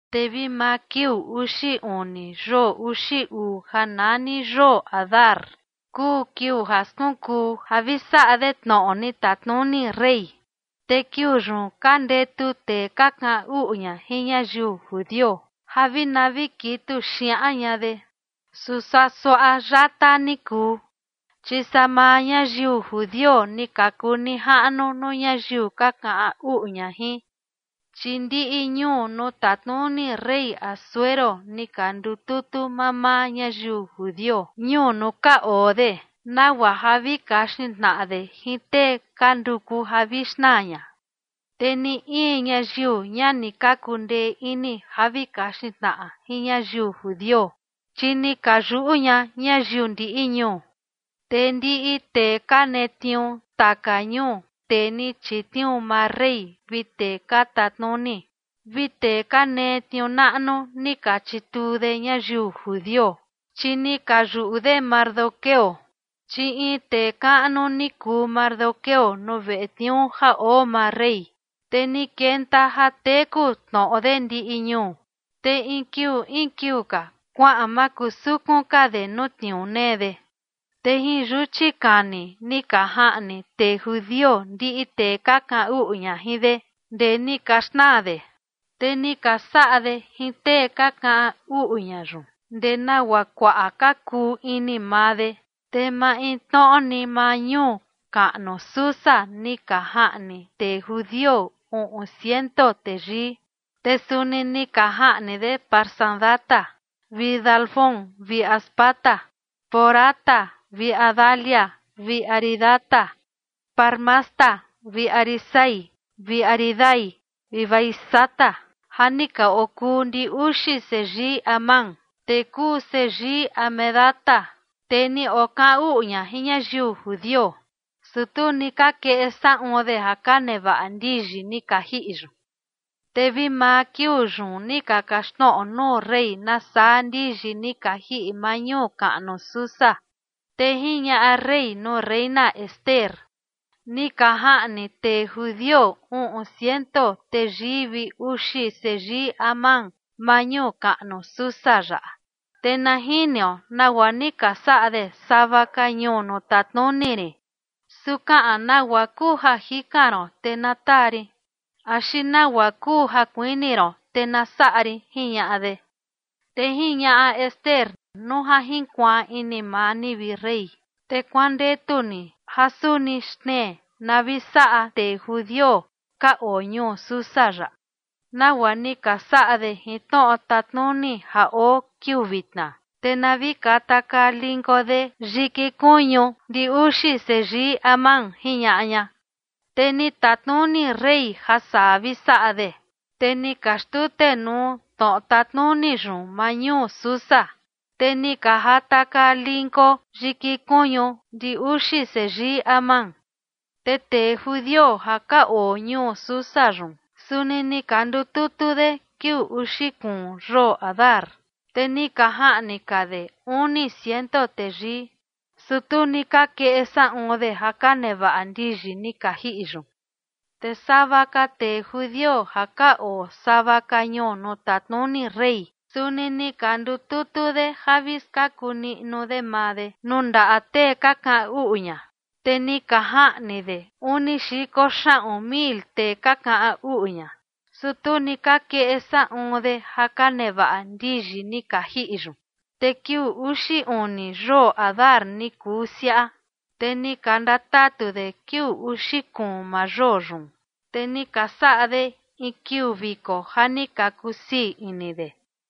Te vi maa kiuu uxi uni yoo uxi uu ja nani yoo Adar, kuu kiuu ja skunkuu ja vi saꞌa de tnoꞌo ni tatnuni rey. Te kiuu yun ka ndetu tee ka kaꞌan uꞌu ña jin ñayiu judio ja vi na vi kitu xiaꞌan ña de. Su saa suaꞌa yata ni kuu, chi saa maa ñayiu judio ni ka kuu nijaꞌnu nuu ñayiu ka kaꞌan uꞌu ña jin. Chi ndiꞌi ñuu nuu tatnuni rey Asuero ni ka ndututu mamaa ñayiu judio ñuu nuu ka oo de, nagua ja vi kaxin tnaꞌa de jin tee ka nduku ja vi xnaa ña. Te ni in ñayiu, ña ni ka kundee ini ja vi kaxin tnaꞌa jin ñayiu judio, chi ni ka yuꞌu ña ñayiu ndiꞌi ñuu. Te ndiꞌi tee ka netniuu taka ñuu, tee ni chitniuu maa rey vi tee ka tatnuni, vi tee ka nee tniuu naꞌnu, ni ka chituu de ñayiu judio, chi ni ka yuꞌu de Mardoqueo. Chi in tee kaꞌnu ni kuu Mardoqueo nuu veꞌe tniuu ja oo maa rey, te ni kenta ja teku tnoꞌo de ndiꞌi ñuu. Te in kiuu in kiuu ka kuaꞌan makusukun ka de nuu tniuu nee de. Te jin yuchi kani ni ka jaꞌni tee judio ndiꞌi tee ka kaꞌan uꞌu ña jin de ndee ni ka xnaa de. Te ni ka saꞌa de jin tee ka kaꞌan uꞌu ña yun ndee nagua kuaꞌa ka kuu ini maa de. Te maintnoꞌo ni maa ñuu kaꞌnu Susa ni ka jaꞌni tee judio uꞌun ciento teyii. Te suni ni ka jaꞌni de Parsandata vi Dalfón vi Aspata, Porata vi Adalía vi Aridata, Parmasta vi Arisai vi Aridai vi Vaizata, ja ni ka okuu ndi uxi seyii Amán, tee kuu seyii Hamedata, tee ni okaꞌan uꞌu ña jin ñayiu judio, su tu ni ka keꞌe saꞌun de ja ka nevaꞌa ndiyi ni ka jiꞌi yun. Te vi maa kiuu yun ni ka kaxtnoꞌo nuu rey nasaa ndiyi ni ka jiꞌi maa ñuu kaꞌnu Susa. Te jiñaꞌa rey nuu reina Ester: ―Ni ka jaꞌni tee judio uꞌun ciento teyii vi uxi seyii Amán maa ñuu kaꞌnu Susa yaꞌa, te na jiniu nagua ni ka saꞌa de sava ka ñuu nuu tatnuni rin. Su kaꞌan nagua kuu ja jikan ron, te na taa rin axi nagua kuu ja kuini ron, te na saꞌa rin ―jiñaꞌa de. Te jiñaꞌa Ester: ―Nuu ja jinkuaan ini maa ni, vi rey, te kuandetu ni ja suni xtnee na vi saꞌa tee judio ka oo ñuu Susa yaꞌa nagua ni ka saꞌa de jin tnoꞌo tatnuni ja oo kiuu vitna, te na vi katakaa linko de yiki kuñu ndi uxi seyii Amán ―jiñaꞌa ña. Te ni tatnuni rey ja saa vi saꞌa de. Te ni ka xtutenuu tnoꞌo tatnuni yun maa ñuu Susa, te ni ka jatakaa linko yiki kuñu ndi uxi seyii Amán. Te tee judio ja ka oo ñuu Susa yun, suni ni ka ndututu de kiuu uxi kuun yoo Adar, te ni ka jaꞌni ka de uni ciento teyii, su tu ni ka keꞌe saꞌun de ja ka nevaꞌa ndiyi ni ka jiꞌi yun. Te sava ka tee judio ja ka oo sava ka ñuu nuu tatnuni rey, suni ni ka ndututu de ja vi skaku niꞌnu de maa de nuu ndaꞌa tee ka kaꞌan uꞌu ña, te ni ka jaꞌni de uni xiko xaꞌun mil tee ka kaꞌan uꞌu ña, su tu ni ka keꞌe saꞌun de ja ka nevaꞌa ndiyi ni ka jiꞌi yun. Te kiuu uxi uni yoo Adar ni kuu siaꞌa, te ni ka ndatatu de kiuu uxi kuun maa yoo yun, te ni ka saꞌa de in kiuu viko ja ni ka kusii ini de.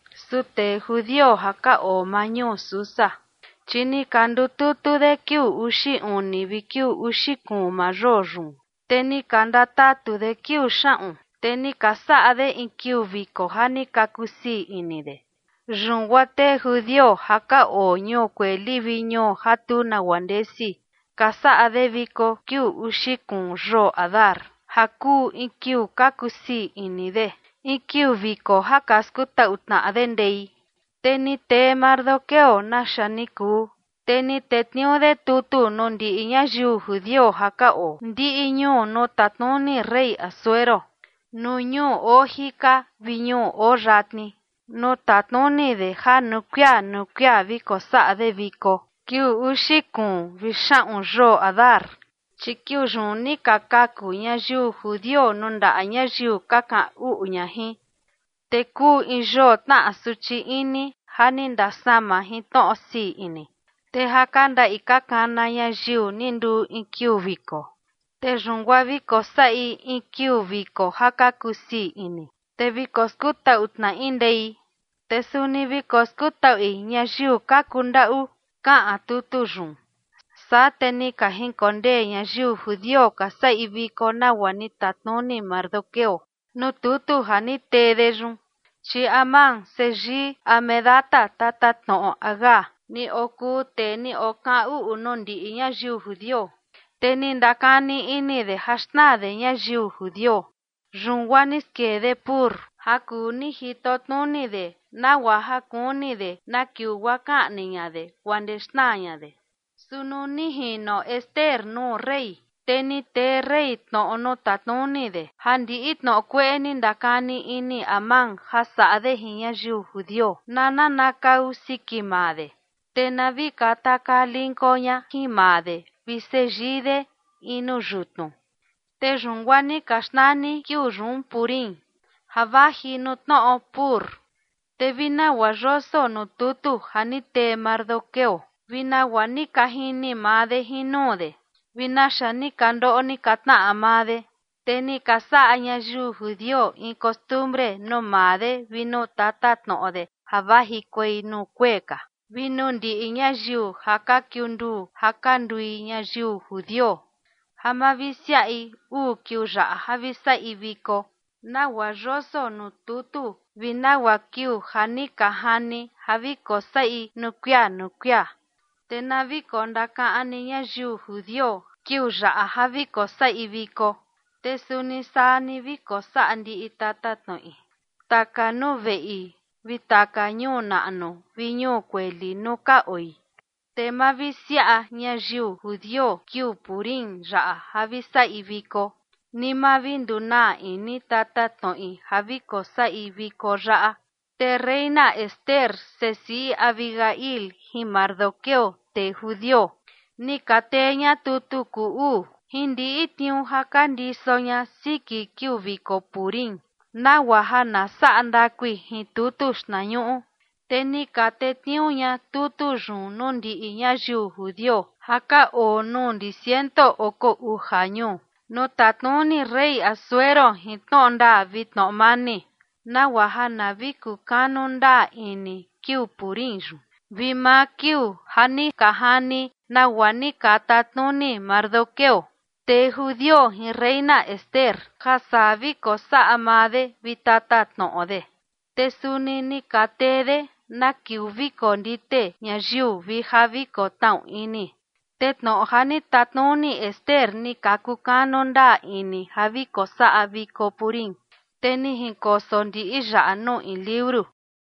Su tee judio ja ka oo maa ñuu Susa, chi ni ka ndututu de kiuu uxi uni vi uxi kuun maa yoo yun, te ni ka ndatatu de kiuu xaꞌun, te ni ka saꞌa de in kiuu viko ja ni ka kusii ini de. Yun guaa tee judio ja ka oo ñuu kueli vi ñuu ja tu nagua ndesi, ka saꞌa de viko kiuu uxi kuun yoo Adar, ja kuu in kiuu ka kusii ini de, in kiuu viko ja ka skutaꞌu tnaꞌa de ndei. Te ni tee Mardoqueo naxa ni kuu, te ni tetniuu de tutu nuu ndiꞌi ñayiu judio ja ka oo ndiꞌi ñuu nuu tatnuni rey Asuero, nuu ñuu oo jika vi ñuu oo yatni, nuu tatnuni de ja nuu kuia nuu kuia vi kosaꞌa de viko kiuu uxi kuun vi xaꞌun yoo Adar. Chi kiuu yun ni ka kaku ñayiu judio nuu ndaꞌa ñayiu ka kaꞌan uꞌu ña jin, te kuu in yoo tnaꞌa suchi ini ja ni ndasama jin tnoꞌo sii ini, te ja ka ndaꞌi ka kana ñayiu ni nduu in kiuu viko. Te yun guaa vi kosaꞌi in kiuu viko ja ka kusii ini, te vi koskutaꞌu tnaꞌi ndei, te suni vi koskutaꞌui ñayiu ka kundaꞌu, kaꞌan tutu yun. Saa te ni ka jinkondee ñayiu judio ka saꞌi viko nagua ni tatnuni Mardoqueo nuu tutu ja ni tee de yun. Chi Amán, seyii Hamedata, tatatnoꞌo Agag, ni okuu tee ni okaꞌan uꞌu nuu ndiꞌi ñayiu judio, te ni ndakani ini de ja xnaa de ñayiu judio, yun guaa ni skee de pur, ja kuu ni jitotnuni de nagua ja kuni de na kiuu guaa kaꞌni ña de guaa ndee xnaa ña de. Su nuu ni jino Ester nuu rey, te ni tee rey tnoꞌo nuu tatnuni de ja ndiꞌi tnoꞌo kueꞌe ni ndakani ini Amán ja saꞌa de jin ñayiu judio, na nanakau siki maa de, te na vi katakaa linko ña jin maa de vi seyii de in nuu yutnu. Te yun guaa ni ka xnani kiuu yun Purim, ja vaji nuu tnoꞌo pur. Te vi nagua yoso nuu tutu ja ni tee Mardoqueo vi nagua ni ka jini maa de jin nuu de vi naxa ni ka ndoꞌo ni ka tnaꞌa maa de. Te ni ka saꞌa ñayiu judio in costumbre nuu maa de vi nuu tatatnoꞌo de ja vajikuei nuu kuee ka, vi nuu ndiꞌi ñayiu ja ka kiunduu ja ka ndui ñayiu judio, ja mavisiaꞌi uu kiuu yaꞌa ja vi saꞌi viko, nagua yoso nuu tutu vi nagua kiuu ja ni ka jani ja vi kosaꞌi nuu kuia nuu kuia. Te na vi kondakaꞌan ni ñayiu judio kiuu yaꞌa ja vi kosaꞌi viko, te suni saa ni vi kosaꞌa ndiꞌi tatatnoꞌi, taka nuu veꞌi vi taka ñuu naꞌnu vi ñuu kueli nuu ka oi. Te mavisiaꞌa ñayiu judio kiuu Purim yaꞌa ja vi saꞌi viko, ni ma vi ndunaa ini tatatnoꞌi ja vi kosaꞌi viko yaꞌa. Te reina Ester, sesiꞌi Abihail, jin Mardoqueo, tee judio, ni ka tee ña tutu kuu uu jin ndiꞌi tniuu ja ka ndiso ña siki kiuu viko Purim, nagua ja na saꞌa ndakui jin tutu xtnañuꞌu. Te ni ka tetniuu ña tutu yun nuu ndiꞌi ñayiu judio ja ka oo nuu ndi ciento oko uja ñuu nuu tatnuni rey Asuero jin tnoꞌo ndaa vi tnoꞌo mani, nagua ja na vi kukanu ndaa ini kiuu Purim yun vi maa kiuu ja ni ka jani, nagua ni ka tatnuni Mardoqueo, tee judio, jin reina Ester, ja saa vi kosaꞌa maa de vi tatatnoꞌo de, te suni ni ka tee de na kiuu vi kondite ñayiu vi ja vi kotnaꞌu ini. Te tnoꞌo ja ni tatnuni Ester ni ka kukanu ndaa ini ja vi kosaꞌa viko Purim, te ni jinkoso ndiꞌi yaꞌa nuu in liuru.